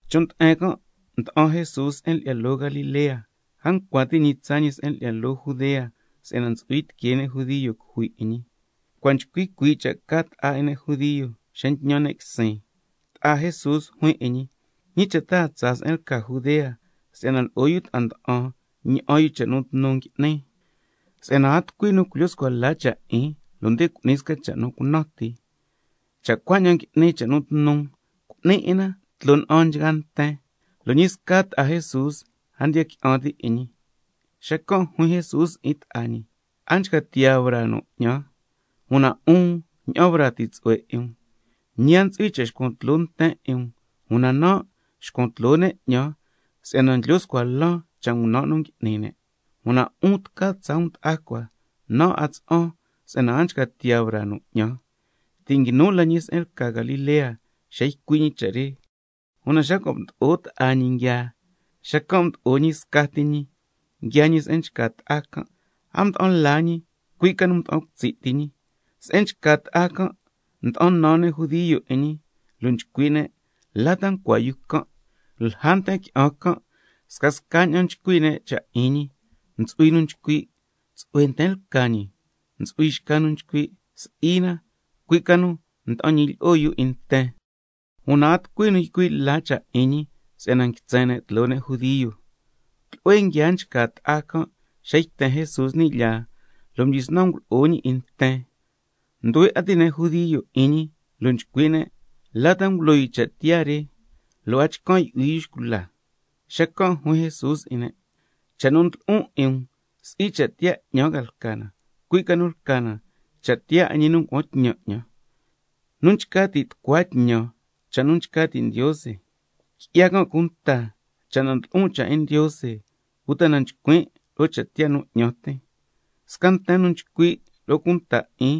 Chon' nde'en can' mda'an Jesús se'en lyi'ya loo Galilea, a ncua ti' ñi tsaa ñi se'en lyi'ya loo Judea, si'yana ntsu'hui tiquee ne' judio cujui 'in ñi. Cua' nchcui cuii' cha' ca ta'a 'in ne' judio xa ntñan ne' quisin. Ta'a Jesús juin 'in ñi: ¿Ñi cha' ta a tsaa se'en lca Judea, si'yana lo'o yu ta'a nda'an ña'an yu cha' nu tnu ngui'ni? Si'yana a tucui nu culyo scua la cha' 'in, cu'ni sca cha' nu cunan ti, Cha' cuaña'an ngui'ni cha' nu tnu, cu'ni 'in na tloo na'an nchgaa nten. Lo' ñi sca ta'a Jesús a ndiya qui'an ti' 'in ñi. Xacan' juin Jesús 'in ta'a ñi: A nchca tiyaa braa nu 'ñan, una 'un ña'an braa ti tsu'hue 'in um. Ñi a ntsu'hui cha' xcuan tloo nten 'in um, una nan' nxcuan tloo ne' 'ñan si'yana ndlyo scua lan cha' ngunan' nu ngui'ni ne'. Una 'un tca tsaa um ta'a cua, nan' a tsa'an si'yana a nchca tiyaa braa nu 'ñan. Ti' nguinu la ñi se'en lca Galilea xa ycui' ñi cha' re. Una xa cua' mdo'o ta'a ñi nguiaa, xacan' mdo'o ñi scati ñi nguiaa ñi se'en nchca ta'a can', a mda'an la ñi, cui' ca nu nda'an cutsi' ti ñi. Se'en nchca ta'a can' nda'an nan ne' judio 'in ñi, lo' nchcui' ne': ¿La ta ncua yu can'? Lja nten qui'an can' scasca ña'an nchcui' ne' cha' 'in ñi, ntsu'hui nu nchcui': Tsu'hue nten lca ñi. Ntsu'hui nu nchcui': Si'i na, cui' ca nu nda'an ñilyi'o yu 'in nten. Una a tucui nu nchcui' la cha' 'in ñi si'yana nguitsen ne' tloo ne' judio. Tlu'hue nguiaa nchca ta'a can' xa yten Jesús ni' lyaa, lo' mdyisnan ngulo'o ñi 'in nten. Nduhue 'a ti' ne' judio 'in ñi, lo' nchcui' ne': ¿La ta ngulo yu cha' tiyaa re, lo' a chcan' yu'hui yu xcula? Xacan' juin Jesús 'in ne': Cha' nu ndlo'on 'in um, si'i cha' tiyaa 'ñan lca na, cui' ca nu lca na cha' tiyaa 'in ñi nu ngua'an tñan 'ñan. Nu nchca ti' tucua tñan cha' nu nchca ti' Ndiose, qui'ya can' cunta cha' na ndlo'on cha' 'in Ndiose, uta na nchcuin' lo'o cha' tiyaa nu 'ñan tin. Sca nten nu nchcui' lo'o cunta 'in,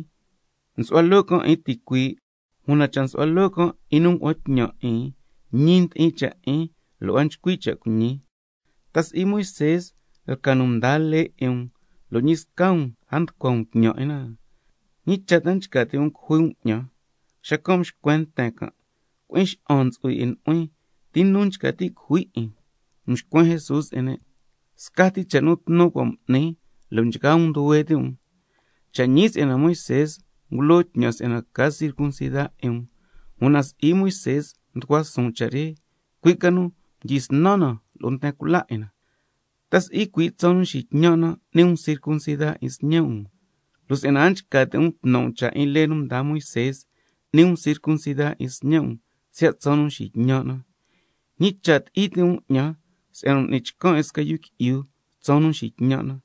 nsu'hua loo can' 'in ticuii', una cha' nsu'hua loo can' 'in nu ngua'an tñan 'in, ñi ndi'in cha' 'in lo' a nchcui' cha' cuiñi. ¿Ta si'i Moisé lca nu mdaa lee 'in um, lo' ñi sca um a nducua um tñan 'in na? ¿Ñi cha' ta nchca ti' um cujui um 'ñan? Xacan' mxcuen nten can': Cui'in xa'an ntsu'hui 'in nu'huin. ¿Ti nu nchca ti' cujui 'in? Mxcuen Jesús 'in ne': Scati cha' nu tnu cua' m'nin, lo' nchgaa um nduhue ti' um. Cha' ñi si'yana Moisé ngulo tñan si'yana ca circuncida 'in um, (una si'i Moisé mducua suun cha' re, cui' ca nu mdyisnan na lo'o nten cula 'in na), ¿ta si'i cui' tsaan nu nxitñan' na n'ni um circuncida 'in sñe' um? Lo' si'yana a nchca ti' um tnan' um cha' 'in lee nu mdaa Moisé, n'ni um circuncida 'in sñe' um siya' tsaan nu nxitñan' na, ¿ñi cha' ti'i ti' um 'ñan si'yana m'nin chcan can 'in sca yu qui'yu tsaan nu nxitñan' na?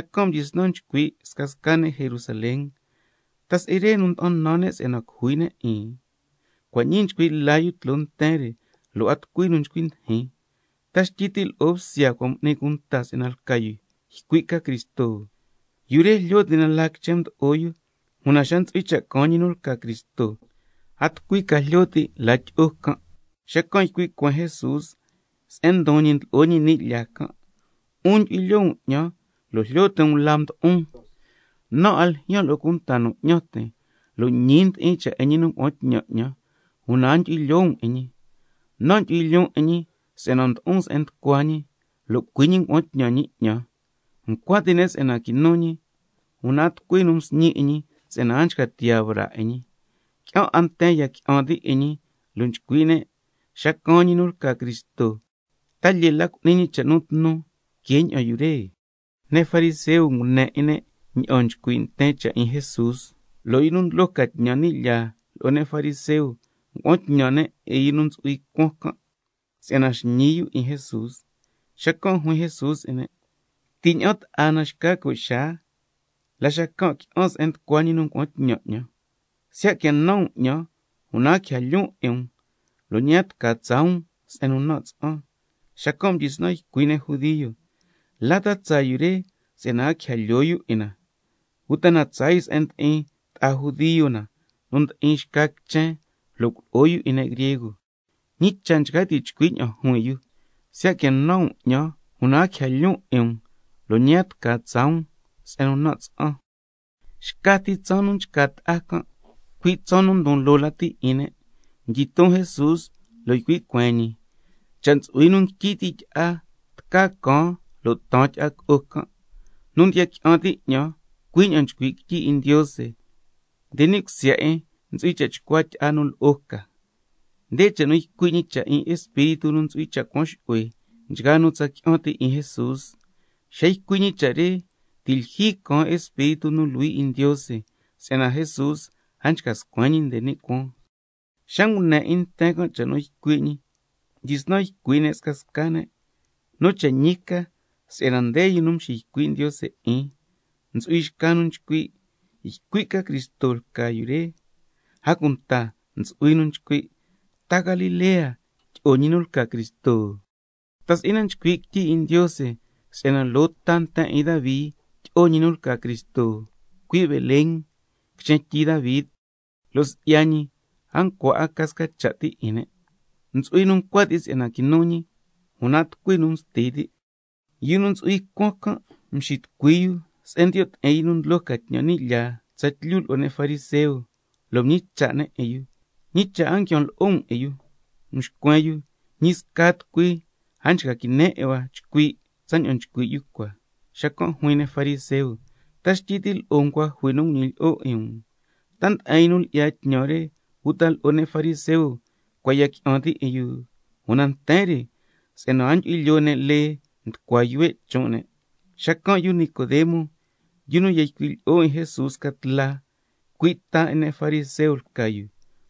Xacan' mdyisnan nchcui' scasca ne' Jerusalén: ¿Ta si'i re nu nda'an nan ne' si'yana cujui ne' 'in? Cua' ñii nchcui' la yu tloo nten re, lo' a tucui nu nchcui ndijin. ¿Ta xtyi ti' lo'o bsya cua' m'ni cunta si'yana lca yu ycui' ca Cristo? Yu re jlyo ti' na la quichen mdo'o yu, una xa ntsu'hui cha' caan ñi nu lca Cristo, a tucui ca jlyo ti' la tyi'o can'. Xacan' ycui' cueen Jesús se'en ndon ñi ndlo'o ñi ni' lyaa can': 'Un ndyu'hui lyoo um 'ñan lo' jlyo ti' um la mdo'on, nan' a ljyaan lo'o cunta nu 'ñan tin, una ñi ndi'in cha' 'in ñi nu ngua'an tñan 'ñan, lo' a ndyu'hui lyoo um 'in ñi. Una nan' ndyu'hui lyoon 'in ñi si'yana mdo'on se'en nducua ñi, lo' cui' ñi ngua'an tñan ñi 'ñan. Ncua ti' ne' si'yana quinu ñi, una a tucui nu msñi 'in ñi si'yana a nchca tiyaa braa 'in ñi. Qui'an 'a nten ya qui'an ti' 'in ñi, lo' nchcui' ne': Xa caan ñi nu lca Cristo, ¿ta lyee la cu'ni ñi cha' nu tnu que ña'an yu re? Ne' fariseo ngune 'in ne' ña'an nchcui' nten can' cha' 'in Jesús, lo' yu nu ndlo ca tñan ni' lyaa lo'o ne' fariseo, ngua'an tñan ne' 'in yu nu ntsu'hui cuan can', si'yana xñi yu 'in Jesús. Xacan' juin Jesús 'in ne': Ti' ña'an ta'a na xca co' xaa, la xacan' qui'an se'en nducua ñi nu ngua'an tñan 'ñan. Siya' quia nan um 'ñan una a quija lyoon 'in um, lo' ñi a tca tsaa um se'en nu nan' tsa'an. Xacan' mdyisnan ycui' ne' judio: ¿La ta tsaa yu re si'yana a quija lyoo yu 'in na? ¿Uta tsaa yu se'en ndi'in ta'a judio na nu ndi'in xca quichen, lo' culo'o yu 'in ne' griego? ¿Ñi cha' nchca ti' chcui' ña'an juin yu: Siya' quia nan um 'ñan una a quija lyoon 'in um, lo' ñi a tca tsaa um se'en nu nan' tsa'an? Xca ti tsaan nu nchca ta'a can', cui' tsaan nu ndon loo lati 'in ne', mdyiton Jesús lo' ycui' cueen ñi: Cha' ntsu'hui nu nguityi ti' tyi'a, tca caan lo' taan tyi'a co'o can'. Nu ndiya qui'an ti' 'ñan, cui' ña'an nchcui' quityi 'in Ndiose, nde ni' cusya 'in ntsu'hui cha' chcua tyi'a nu lo'o ca. Nde cha' nu ycui' ñi si'ya Espíritu 'in Ndiose nu ntsu'hui cha' cha'an yu'hui ni' cusya 'in nchgaa nu tsa qui'an ti' 'in Jesús. Xa ycui' ñi cha' re ti' lyijyi caan Espíritu nu Luhui 'in Ndiose, si'yana Jesús a nchca scuen ñi nde ni' cuaan. Xa ngune 'in nten can' cha' nu ycui' ñi mdyisnan ycui' ne' scasca ne': Nu cha' ñi ca si'yana nde yu nu nxiycui' Ndiose 'in. Ntsu'hui xca nu nchcui': Ycui' ca Cristo lca yu re. A cunta ntsu'hui nu nchcui': ¿Ta Galilea tyi'o ñi nu lca Cristo? ¿Ta si'i na nchcui' quityi 'in Ndiose si'yana —loo ta nten 'in Davi tyi'o— ñi nu lca Cristo, —cui' Belén— quichen tyi Davi? Lo' si'ya ñi a ncua ca sca cha' ti 'in ne'. Ntsu'hui nu ncua ti' si'yana quinu ñi, una a tucui nu msti ti'. Yu nu ntsu'hui cuan can' mxitucui yu se'en ndiyo' ti'in yu nu ndlo ca tñan ni' lyaa tsatlyu lo'o ne' fariseo, lo' mñicha' ne' 'in yu: ¿Ñi cha' ta a nguian lo'o um 'in yu? Mxcuen yu: Ñi sca tucui lo' a nchca quine 'in hua chcui' tsaña'an nchcui' yu cua. Xacan' juin ne' fariseo: ¿Ta xtyi ti' lo'o um cua' jui nu nguñilyi'o 'in um? ¿Ta nde'en yu nu lyi'ya tñan re uta lo'o ne' fariseo cua' ya qui'an ti' 'in yu? Una nten re si'yana a ndyu'hui lyoo ne' lee, nducua yuhue' chon' ne'. Xacan' yu Nicodemo, yu nu ya ycui' lyi'o Jesús sca tla, cui' ta nten 'in ne' fariseo lca yu,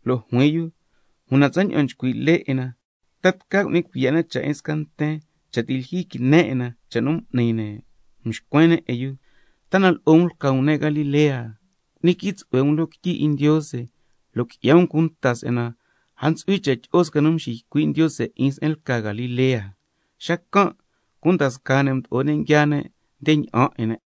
lo' juin yu: Una tsaña'an nchcui' lee 'in na, ¿ta tca cu'ni cuiya' na cha' 'in sca nten, cha' ti' lyijyi quine 'in na cha' nu m'ni ne'? Mxcuen ne' 'in yu: ¿Ta na lo'o um lca um ne' Galilea? Cu'ni quii tsu'hue um loo quityi 'in Ndiose lo' qui'ya um cunta si'yana a ntsu'hui cha' tyi'o sca nu nxiycui' Ndiose 'in se'en lca Galilea. Xacan' cunda scaa ne' mdo'o ne' nguiaa ne' nde ña'an 'in ne'.